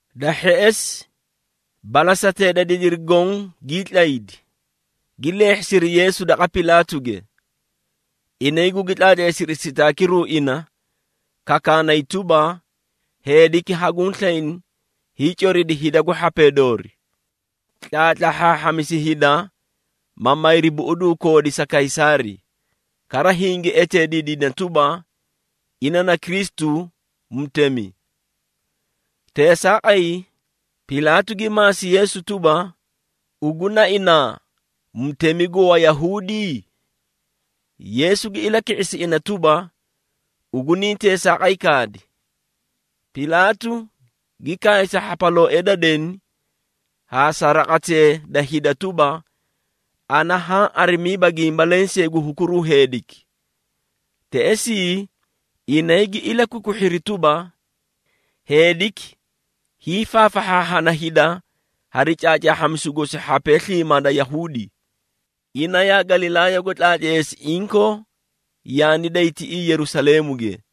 Da hheꞌesi, balasatee da didiri goõ gii tlaydi, gi leehhisiri Yeesu daqa Pilaatuge. Inay gugi tlaatleesiri sitaakiru ina, kakaanay tuba, “Heediki haguũ slayni hiicoridi hida gu hhapee doori. Tlaatlahhaahhamisi hida, ma mayri buꞌuduu koodi sa Kaysaari, kara hingi eteediidina tuba, ina na Kristu, mutemi.” Teesaaqay, Pilaatu gi maasi Yeesu tuba, “Ugu na inaa mutemi gu Wayahuudi?” Yeesu gi ilaki⁄isi ina tuba, “Ugu niĩ teesaaqay kaadi!” Pilaatu gi kaay sa hhapalooee da deni haa sa raqatee da hida tuba, “Ana haã arimiiba gimba lensee gu hukuruu heediki!” Teꞌesii, inay gi ilakwikwihhiri tuba, “Heediki hiifaafahhaahhana hida hari caacaahhamisu gosi hhapee sliimaa da Yahuudi. Ina yaa Galilaayago tlaatleesi inkoo yaani day tiꞌii Yerusaleemuge!”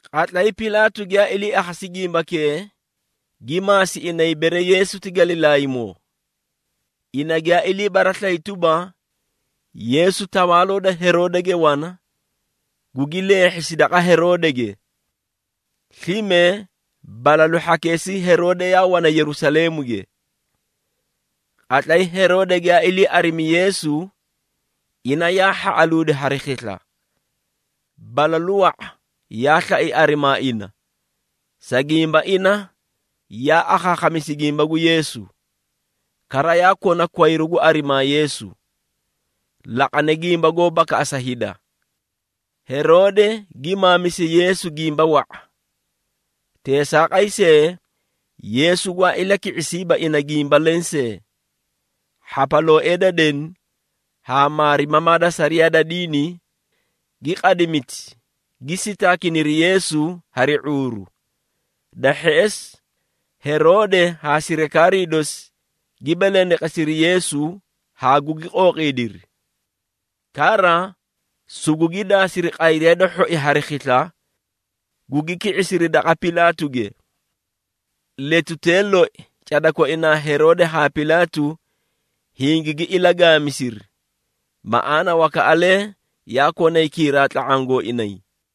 Qatlay Pilaatu giyaa ilii akhasi gimbakee, gi maasi inay bere Yeesu ti Galilaaymoo. Ina giyaa ilii baraslayi tuba, Yeesu tawaaloo da Heroodege wana, gugi leehhisi daqa Heroodege, slime balalu hhakeesii Heroode yaa wana Yerusaleemuge. Qatlay Heroode giyaa ilii arimi Yeesu, ina yaa hhaꞌaluudi hari khisla. Balalu wa⁄a yaa slai arimaa ina, sa gimba ina yaa akhaakhamisi gimba gu Yeesu. Kara yaa kona kwayru gu arimaa Yeesu, laqane gimba goó bakaꞌasa hida. Heroode gi maamisi Yeesu gimba wa⁄a. Teesaaqay see, Yeesu gwaa ilaki⁄isiiba ina gimba lensee. Hhapalooee da deni haa maarimamaa da sariyaa da diini, gi qadimiti, gi sitaakiniri Yeesu hari ⁄uuru. Da hheꞌesi, Heroode haa sirikaarii dosi, gi belendeqesiri Yeesu haa gugi qooqiidiri. Kara, sugugi daasiri qayriya da hhoi hari khisla, gugi ki⁄isiri daqa Pilaatuge. Letutee loi, cada koinaa Heroode haa Pilaatu hingigi ilagaamisiri. Maꞌaana wakaꞌalee yaa konay kiiraa tla⁄aã gooinay.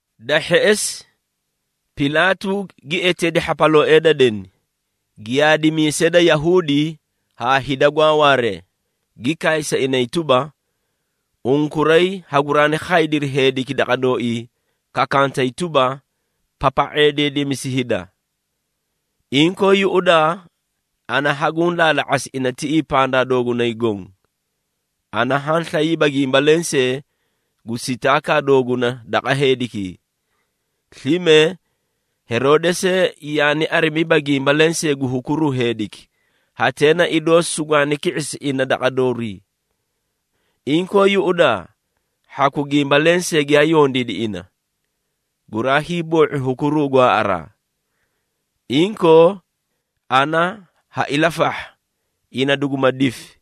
Da hheꞌesi, Pilaatu gi eteedi hhapalooee da deni, giyaadimiisee da Yahuudi haa hida gwaa waaree, gi kaay sa inay tuba, “Unkuray haguraani khaydiri heediki daqa dooii kakantay tuba, papa⁄eedeedemisi hida. Inkoo yuꞌudaa, ana haguũ laala⁄asi ina tiꞌii pandaa doogunay goõ. Ana haã slayiiba gimba lensee gu sitaakaa dooguna daqa heedikii. Slime, Heroode see yaani arimiiba gimba lensee gu hukuruu heediki, hatee na idoo sugwaani ki⁄isi ina daqa doorii. Inkoo yuꞌudaa, hhaku gimba lensee giyaa yondiidi ina, guraa hiiboo⁄u hukuruu gwaaꞌaraa. Inkoo, ana ha ilafahha, ina duguma difi,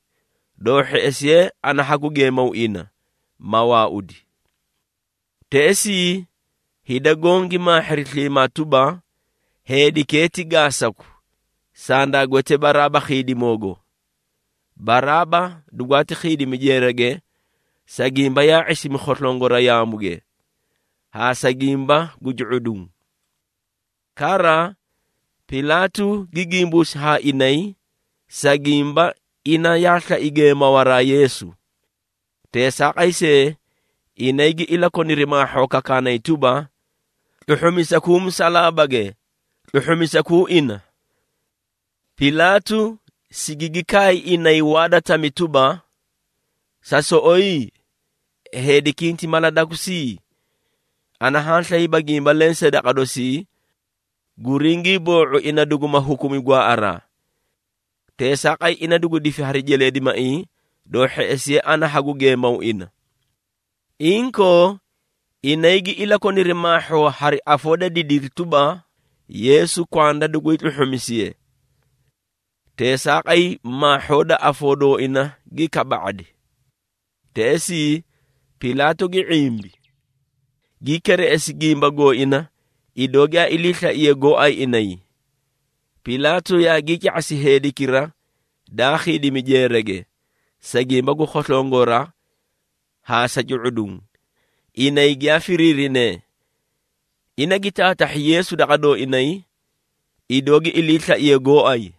doo hheꞌesiye ana hagu geemaw ina, ma waaudi.” Teꞌesii, hida goõ gi maahhiri sliimaa tuba, “Heedikee ti gaasaku! Sandaa gwete Baraaba khiidimoogo!” (Baraaba dugwaati khiidimi jeerage, sa gimba yaa ⁄isimi khoslongora yaamuge, haa sa gimba gu cu⁄uduũ.) Kara, Pilaatu gi gimbuusi haa inay, sa gimba, ina yaa slai geemawaraa Yeesu. Teesaaqay see, inay gi ilakoniri maahhoo kakaanay tuba, “Tluhhumisakuu musalaabage, tluhhumisakuu ina!” Pilaatu sigigi kaay inay waa da tami tuba, “Sa soꞌoyi? Heediki hinti mala dakusi? Ana haã slayiiba gimba lensee daqa dosii, guringii boo⁄u ina duguma hukumi gwaaꞌaraa. Teesaaqay, ina dugu difi hari jeleedimaiĩ, doo hheꞌesiye ana hagu geemaw ina.” Inkoo, inay gi ilakoniri maahhoo hari afoo da didiri tuba, Yeesu kwanda dugu hiitluhhumisiye. Teesaaqay maahhoo da afoo dooina gi kaba⁄adi. Teꞌesii, Pilaatu gi ⁄imbi, gi kereꞌesi gimba gooina, idoo giyaa iliislaiyee gooay inay. Pilaatu yaagii ca⁄asi heedikira daa khiidimi jeerage, sa gimba gu khoslongora haa sa cu⁄uduũ, inay giyaa firiirinee. Ina gi taatahhi Yeesu daqa dooinay, idoo gi iliislaiyee gooay.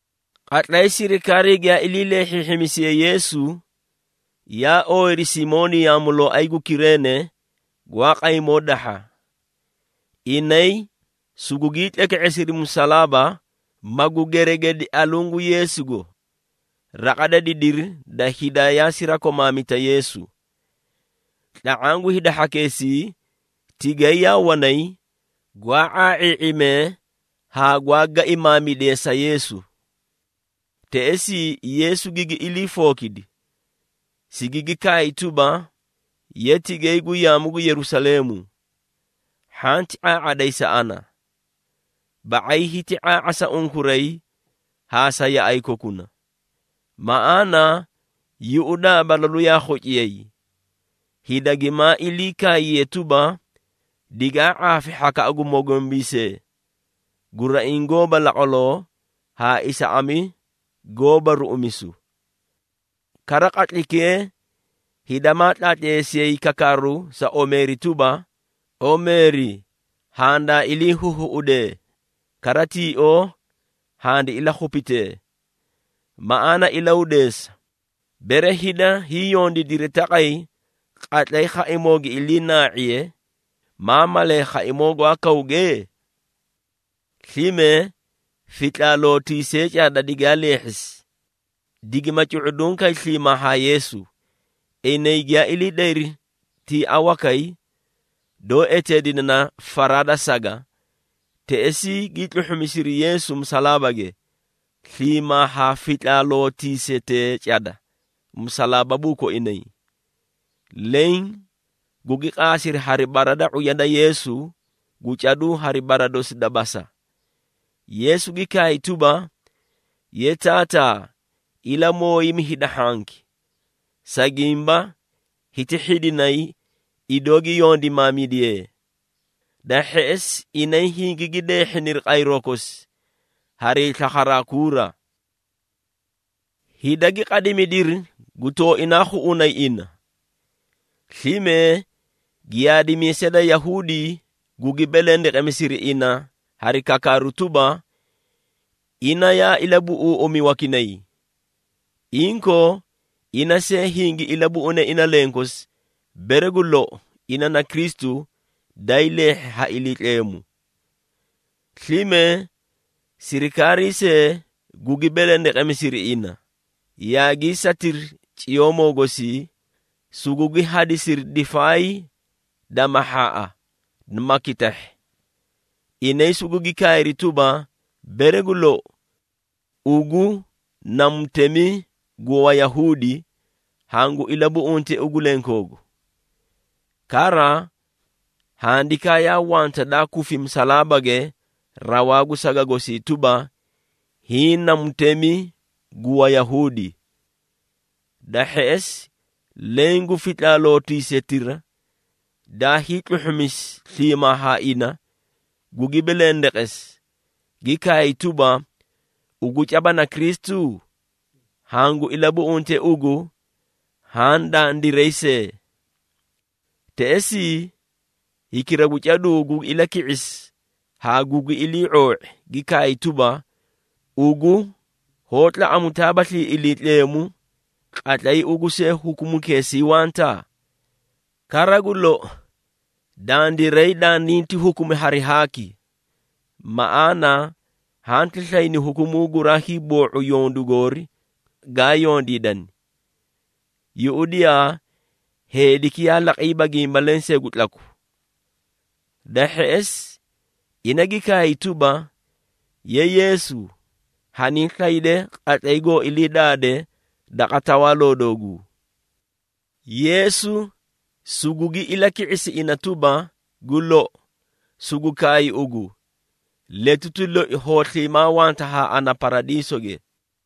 Qatlay sirikaarii giyaa ilii leehhiihhimisiyee Yeesu, yaa ooyiri Simooni yaamulooay gu Kireene, gwaa qaymoo dahha. Inay sugugii tleke⁄esiri musalaaba, magu geregedi aluũ gu Yeesugo. Raqa da didiri da hida yaa sirakomaamita Yeesu. Tla⁄aã gu hida hhakeesii tigay yaa wanay, gwaa ⁄aa⁄ii⁄imee haa gwaa gaimaamidee sa Yeesu. Teꞌesii, Yeesu gigi ilii fookidi, sigigi kaay tuba, “Ye tigayi gu yaamu gu Yerusaleemu, hhanti ⁄aa⁄aday sa ana. Ba⁄ay hiti ⁄aa⁄a sa unkuray haa sa yaꞌay kokuna. Maꞌaana, yuꞌudaa balalu yaa khociyay, hida gimaa iliikaayiyee tuba, ‘Digaa ⁄aafi hhakaꞌa gu mogombiisee, guraiĩ goóba laqwaloo haa isaꞌami goóba ruꞌumisu!’ Kara qatlaykee, hida maa tlaatleesiyay kakaaru sa omeeri tuba, ‘Omeeri handaa iliihuhuꞌudee, kara tioo handi ilakhupitee!’ Maꞌaana ilahudeesa, bere hida hiĩ yondiidiri taqay qatlay khaimoo gi ilii naa⁄iye, maa malaaꞌay khaimoo gwaa kawge?” Slime fitlaalootiisee cada digaa leehhisi, digima cu⁄uduũ kay sliimaa haa Yeesu. Inay giyaa ilii dayri tiia wakay, doó eteedine na “Faraa da Saga,” teꞌesii gii tluhhumisiri Yeesu musalaabage, sliimaa haa fitlaalootuusetee cada musalaababuu koinay. Leẽ gugi qaasiri hari bara da ⁄uya da Yeesu gu caduu hari bara dosi da basa. Yeesu gi kaay tuba, “Ye Taataa, ilamooyimi hida hhanki, sa gimba hiti hhidinay, idoo gi yondimaamidiyee.” Da hheꞌesi, inay hingigi deehhiniri qayroo kosi, harii slakharaa kuura. Hida gi qadimidiri gu tooinaa khuꞌunay ina. Slime giyaadimiisee da Yahuudi gugi belendeqemisiri ina hari kakaaru tuba, “Ina yaa ilabuꞌuuꞌumi wakinay. Inkoo, ina see hingi ilabuꞌune ina lenkosi, bere gu lou ina na Kristu, daay leehhi ha Iliitleemu.” Slime sirikaarii see, gugi belendeqemisiri ina, yaagii satiri ciyoomoo gosii, sugugi hadisiri difaay da mahhaaꞌa, ma kitahhi. Inay sugugi kaayri tuba, “Bere gu lou, ugu na mutemi gu Wayahuudi, hangu ilabuꞌunte ugu lenkoogu.” Kara handikaa yaa wanta daa kufi musalaabage rawaa gu saga gosii tuba, “HIĨ NA MUTEMI GU WAYAHUUDI.” Da hheꞌesi, leẽ gu fitlaalootuusetira, daa hiitluhhumisi sliimaa haa ina, gugi belendeqesi, gi kaay tuba, “Ugu caba na Kristu? Hangu ilabuꞌunte ugu haã dandiray see.” Teꞌesii, hikira gu caduu gugi ilaki⁄isi haa gugi ilii⁄oo⁄i, gi kaay tuba, “Ugu hoó tlaꞌamutaabaslii Iliitleemu, qatlay ugu see, hukumukeesii wanta? Kara gu lou, dandiray dandinti hukumi hari haaki, maꞌaana hanti slayni hukumuu guraa hiiboo⁄u yondu goori gaa yondiidani. Yuꞌudiyaa, heediki yaa laqiiba gimba lensee gu tlaku.” Da hheꞌesi, ina gi kaay tuba, “Ye Yeesu, hanii slayde qatlay goo ilii daade daqa Tawaaloo dooguu.” Yeesu sugugi ilaki⁄isi ina tuba, “Gu lou, sugu kaay ugu, letuti loi hoo sliimaa wanta haa ana Paradiisoge.”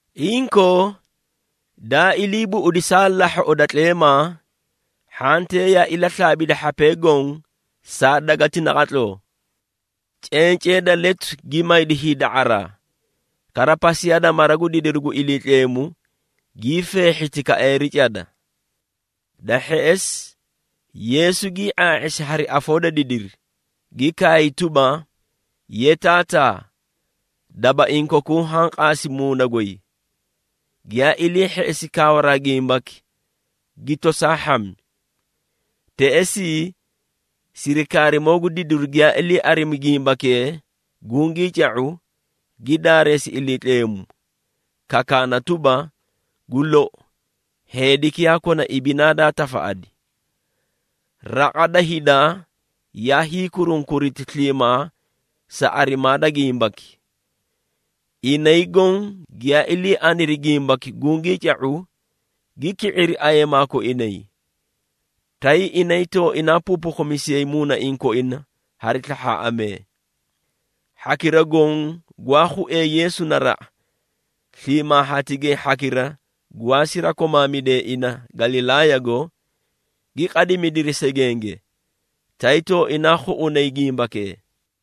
Inkoo, daa ilii buꞌudi saa lahhoꞌo da tleemaa, hhantee yaa ilaslaabidi hhapee goõ saa gweleti naqatloo. Cencee da letu gi maydi hiida⁄araa, kara pasiyaa da mara gu didiru gu Iliitleemu gii feehhiti kaeeri cada. Da hheꞌesi, Yeesu gii ⁄aa⁄isi hari afoo da didiri, gi kaay tuba, “Ye Taataa, dabaiĩ kokuu haã qaasi muuna goy.” Giyaa ilii hheꞌesi kaawaraa gimbaki, gi tosaa hhami. Teꞌesii, sirikaarimoo gu didiru giyaa ilii arimi gimbakee gungii ca⁄u, gi daareesi Iliitleemu, kakaana tuba, “Gu lou, heediki yaa kona ibinaa daa tafaꞌadi.” Raqa da hida yaa hiikurunkuriti sliimaa sa arimaa da gimbaki. Inay goõ giyaa ilii aniri gimbaki gungii ca⁄u, gi ki⁄iri ayeemaa koinay, tay inay tooinaa puupukhumisiyay muunaiĩ koina hari slahhaaꞌamee. Hhakira goõ gwaa khuee Yeesu naraꞌa, sliimaa haa tigay hhakira gwaa sirakomaamidee ina Galilaayago, gi qadimidiri segenge, tay tooinaa khuꞌunay gimbakee.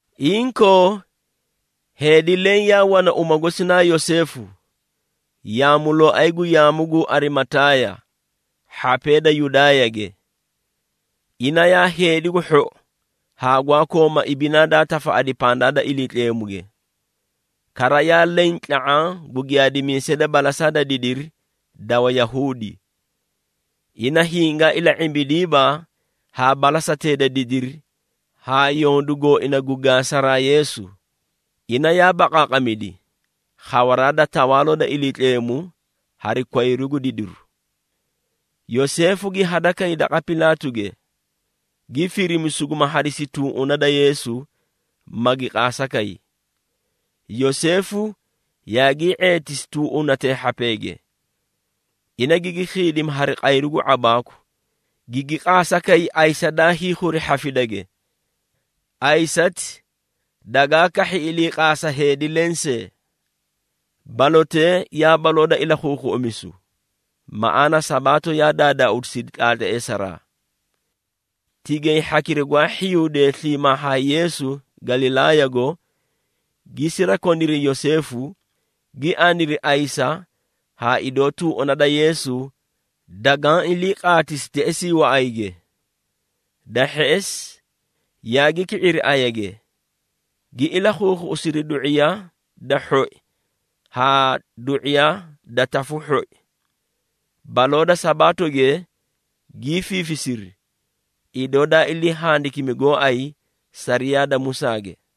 Inkoo, heedi leẽ yaa wana uma gosi na Yoseefu, yaamulooay gu yaamu gu Arimataaya, hhapee da Yudaayage. Ina yaa heedi gu hhou haa gwaa kooma ibinaa daa tafaꞌadi pandaa da Iliitleemuge. Kara yaa leẽ tla⁄aã gu giyaadimiisee da balasaa da didiri da Wayahuudi. Ina hingaa ila⁄imbidiiba haa balasatee da didiri haa yondu gooina gu gaasaraa Yeesu, ina yaa baqaaqamidi, khawaraa da Tawaaloo da Iliitleemu hari kwayru gu didiru. Yoseefu gi hadakay daqa Pilaatuge, gi firimi suguma hadisi tuuꞌuna da Yeesu, magi qaasa kay. Yoseefu yaagii ⁄eetisi tuuꞌunatee hhapeege. Ina gigi khiidimi hari qayru gu ⁄abaaku, gigi qaasa kay ayisa daa hiikhuri hhafidage. Ayisati dagaa kahhi iliiqaasa heedi lensee. Balotee yaa baloo da ilakhuukhuꞌumisu, maꞌaana, Sabaato yaa daadaauusidi tlaatleesaraa. Tigay hhakira gwaa hhiyuudee sliimaa haa Yeesu Galilaayago, gi sirakoniri Yoseefu, gi aniri ayisa haa idoo tuuꞌuna da Yeesu dagaã ilii qaatisi teꞌesii waꞌayge. Da hheꞌesi, yaagi ki⁄iri ayage, gi ilakhuukhuꞌusiri du⁄iya da hhoi haa du⁄iya da tafu hhoi. Baloo da Sabaatoge gii fiifisiri, idoo daa ilii handikimi gooay sariyaa da Musaage.